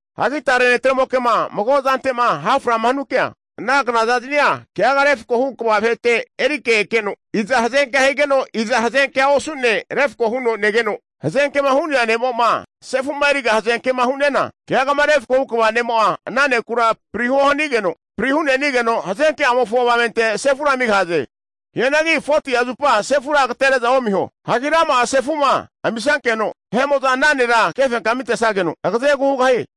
Hagi tare netremoke'ma mago zante'ma haframa hanukea, ana knazaznia keaga refkohu kva vahete erike ekeno, iza hazenkea higeno, iza hazenkea osu'ne, refko huno negeno, hazenkema hu'nea ne'mo'ma sefu'ma eriga hazenkema hu'ne'na, keagama refkohu kva ne'mo'a ana nekura prihuo hanigeno, pri hu'ne'nigeno hazenke'amofo avamente sefura amigahaze. Hianagi 40'a zupa sefura agatere'za omiho. Hagi rama'a sefu'ma amisankeno vahe'mo'za ana nera kefenkamitesageno agazegu hugahie.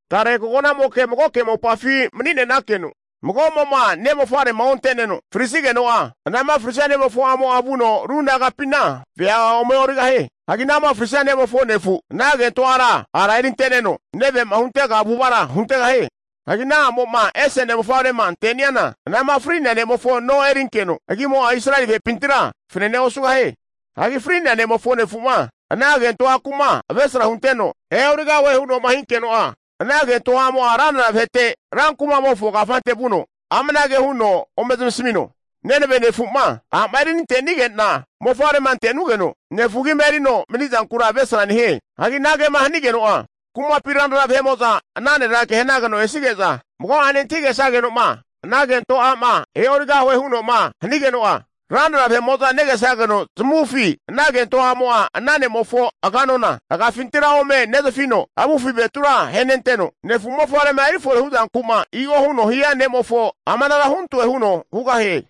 Tare koganamoke magoke mopafi mani'nenakeno, mago'mo'ma ne' mofavrema onte'neno frisigeno'a, anama frisia ne'mofo a'mo'a vuno ru nagapina vea ome e'origahie. Hagi anama frisia ne'mofo nefu, ana kento ara erinte'neno, neve'ma huntega avu'avara huntegahie. Hagi ana a'mo'ma ese ne' mofavrema ante'niana, anama fri'nea ne'mofo no erinkeno, agimo'a Israeli vahepintira fanane osugahie. Hagi fri'nea ne'mofo nefu'ma ana kento aku'ma avesra hunteno e'origahue huno'ma hinkeno'a, ana kento a'mo'a ranra vahete ra kuma'mofo kafante vuno, amanage huno ome zamasmino, nenave nefu'a a'ma erinante'nige'na mofavrema ante'nugeno nefu agima erino mani'zankura avesra nehie. Hagi anagema hanigeno'a kumapi ranra vahe'mo'za ana nera kehanageno esige'za, mago'ane antahigesageno'ma ana kento a'ma e'origahue huno'ma hanigeno'a, ranra vahe'mo'za negesageno zamavufi ana kento a'mo'a, ana ne'mofo aganona agafintira ome nezafino, avufi avetura ahenenteno, nefu mofavrema erifore hu'zanku'ma i'o huno'ma hia ne'mofo amanara huntoe huno hugahie.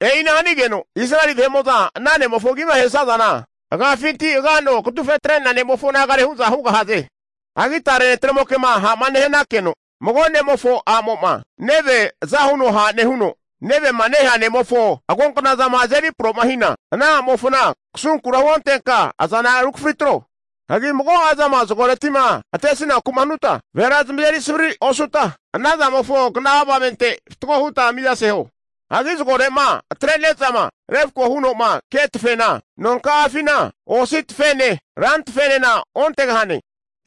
E'ina hanigeno Israeli vahe'mo'za ana ne'mofo agima ahesazana, agafinti agano kazufetre'nea ne'mofo nagare hu'za hugahaze. Hagi tare netre'mokema ha'ma nehanankeno, mago ne'mofo a'mo'ma neve aza huno ha' nehuno, nevema nehea ne'mofo agonknazama azeri promahina, ana a'mofona kasunkura huontenka azana rukafri atro. Hagi mago'azama zagoreti'ma atesinaku'ma hanuta, vahera zamazeri savrira osuta, ana zamofo kna'a avamente fatgo huta mizaseho. Hagi zagore'ma atre'nezama refko huno'ma ke tafena, nonka'afina osi tafene rantafenena ontegahane.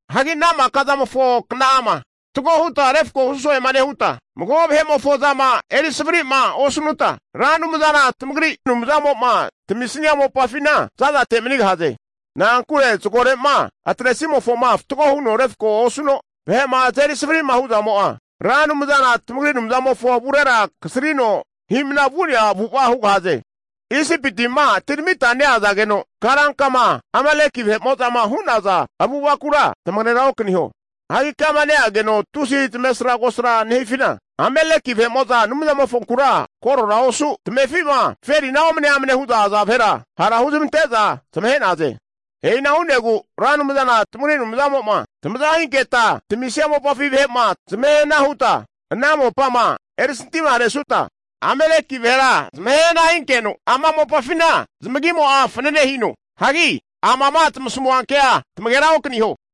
Hagi ana maka zamofo kna'ama fatgo huta refko hu so'ema nehuta, mago vahe'mofo zama eri savari'ma osanuta, Ra Anumzana tamagri Anumzamo'ma tamisnia mopafina za'zate manigahaze. Na'ankure zagore'ma atre'zamofoma fatgo huno refko osuno, vahe'ma azeri savri'ma hu'zamo'a, Ra Anumzana tamagri Anumzamofo avurera kasarino hi'mna vu'nea avu'ava hugahaze. Isipiti'ma atiramita neazageno karankama Ameleki vahe'mo'zama hu'naza avu'avakura tamagera okaniho. Hagi kama neageno tusi tamesra kosrama nehazafina, Ameleki vahe'mo'za Anumzamofonkura korora osu, tamefi'ma zaferina omne amnema hu'za aza vahera, hara huzmante'za zamahe'naze. E'ina hu'negu Ra Anumzana tamagri Anumzamo'ma tamaza hinketa tamisia mopafi vahe'ma zamahehana huta, ana mopama erisantiharesuta Ameleki vahera zamahe hana hinkeno, ama mopafina zamagimo'a fananehino. Hagi amama tamasmua kea tamagera okaniho.